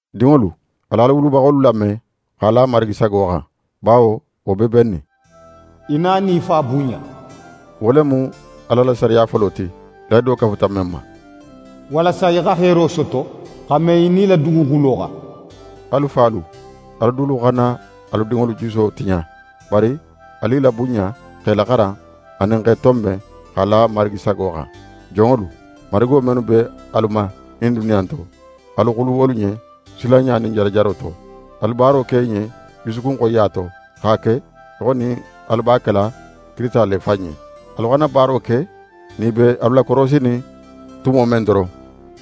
Dinŋolu, al'alu wulubaxolu lame x'a la Marigi sago xan, bawo wo be bennin. «Í na nin í fa bunɲa.» Wo le mu Ala la sariya folo ti, lahido kafuta men ma: «walasa í xa heero soto, xa me í nila duguxulo xan.» Alu falu, alu dulu xana alu dinŋolu juso tiɲa, bari alu i labunɲa, x'e laxaran anin x'e tonben x'a la Marigi sago xan. Jonŋolu, marigo mennu be alu ma ɲin duniya in to, alu xulu wolu ɲen silanɲa nin jarajaro to. Alu baaro ke i ɲen jusukun xoyiya to, x'a ke í xo nin alu b'a kela Kirisita le fan ɲen. Alu xana baaro ke nin i be alu lakorosinin tumo men doron,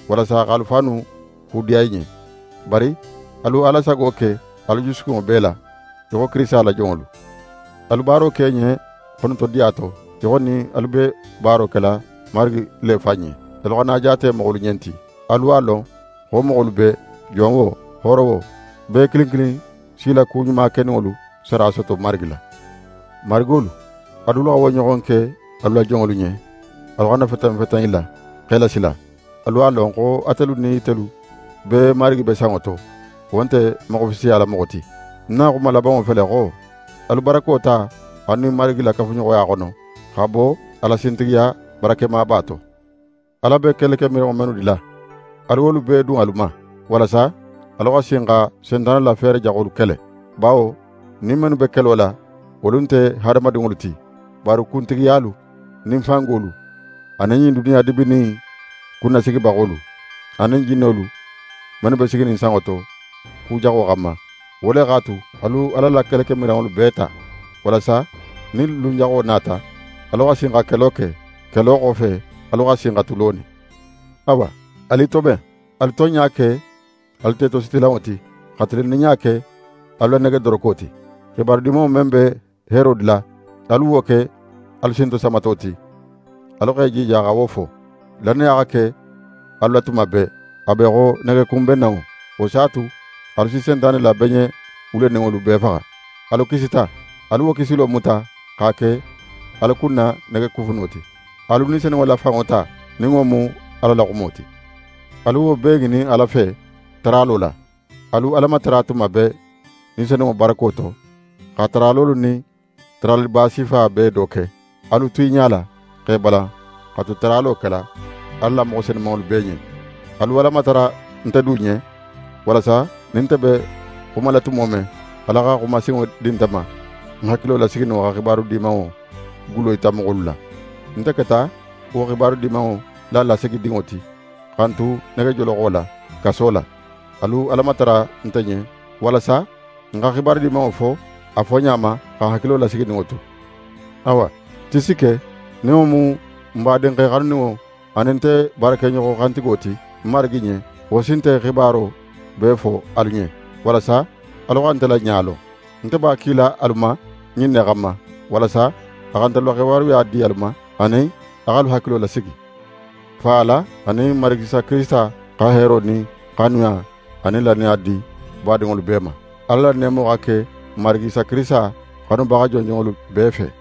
walasa x'alu fannu kudiya i ɲen; bari alu Ala sago ke alu jusukunŋo bee la, í xo Kirisita la jonŋolu. Alu baaro ke i ɲen xonotodiya to, í xo nin alu be baaro kela Marigi le fan ɲen. Alu xana a jaate moxolu ɲen ti. Alu a lon xo moxolu bee, jon wo, hooro wo, bee kilin kilin s'í la ku ɲuma keninŋolu sara soto Marigi la. Marigolu, alu dulu xa wo ɲoxon ke alu la jonŋolu ɲen, alu xana feten feten i la, x'e lasila. Alu x'a lon xo atelu nin itelu bee Marigi be sanŋo to, wo nte moxo fisiyala moxo ti. Ń na xuma labanŋo fele xo: Alu barako ta alu nin Marigi la kafuɲoxoya xono, xa bo a la sintigiya barakemaba to. Ala be kelekemiranŋo mennu dila, alu wolu bee dun alu ma, walasa alu xa sin xa Sentane la feere jaxolu kele. Bawo n nin mennu be kelo la, wolu nte hadamadinŋolu ti, bari kuntigiyalu nin fangolu, anin ɲin duniya dibinin in kunnasigibaxolu, anin jinnolu mennu be siginin sanŋo to, ku jaxo xanma. Wo le x'a tu, alu Ala la kelekemiranŋolu bee ta, walasa nin lun jaxo nata, alu xa sin xa kelo ke; kelo xofe, alu xa sin xa tu lonin. Awa, alu i toben! Alu tonɲa ke alu tetositilanŋo ti, xa tilinninɲa ke alu la negedoroko ti. xibaru Dimanŋo men be heero dila, wo xa ke alu sintosamato ti, alu x'e jija xa wo fo. Lannaya xa ke alu la tuma bee, a be í xo negekunbennanŋo, wo s'a tu alu si Sentane la beɲe wuleninŋolu bee faxa. Alu kisita, alu wo kisilo muta x'a ke alu kunna negekufuno ti. Alu Ni Senunŋo la fanŋo ta, nin wo mu Ala la xumo ti. Alu wo bee ŋinin Ala fe, taralo la. Alu Ala matara tuma bee Ni Senunŋo barako to, xa taralolu nin taraliba sifa bee do ke. Alu tu i ɲala, x'e balan xa tu taralo kela Ala la moxo senumanŋolu bee ɲen. Alu Ala matara nte du ɲen, walasa nin nte be xumala tumo men, Ala xa xuma sinŋo di nte ma, ń hakilo lasigininŋo xa Xibaru Dimanŋo gullo yita moxolu la. Nte keta wo Xibaru Dimanŋo la lasigidinŋo ti, xa ń tu negejoloxo la, kaso la. Alu Ala matara nte ɲen walasa ń xa Xibaru Dimanŋo fo a foɲa ma, xa ń hakilo lasigininŋo tu. Awa, Tisike, nin wo mu n badinxe xanuninŋo, anin nte baarakeɲoxo xantigo ti Marigi ɲen, wo si nte xibaro bee fo alu ɲen, walasa alu xa nte la ɲa lon. Nte b'a kila alu ma ɲin ne xanma, walasa a xa ntelu la xibaruya di alu ma, anin a x'alu hakilo lasigi. Fa Ala anin Marigi Isa Kirisita xa heero nin xanuya anin lannaya di badinŋolu bee ma. Ala la neemo xa ke n Marigi Isa Kirisita xanubaxa jonjonŋolu bee fe.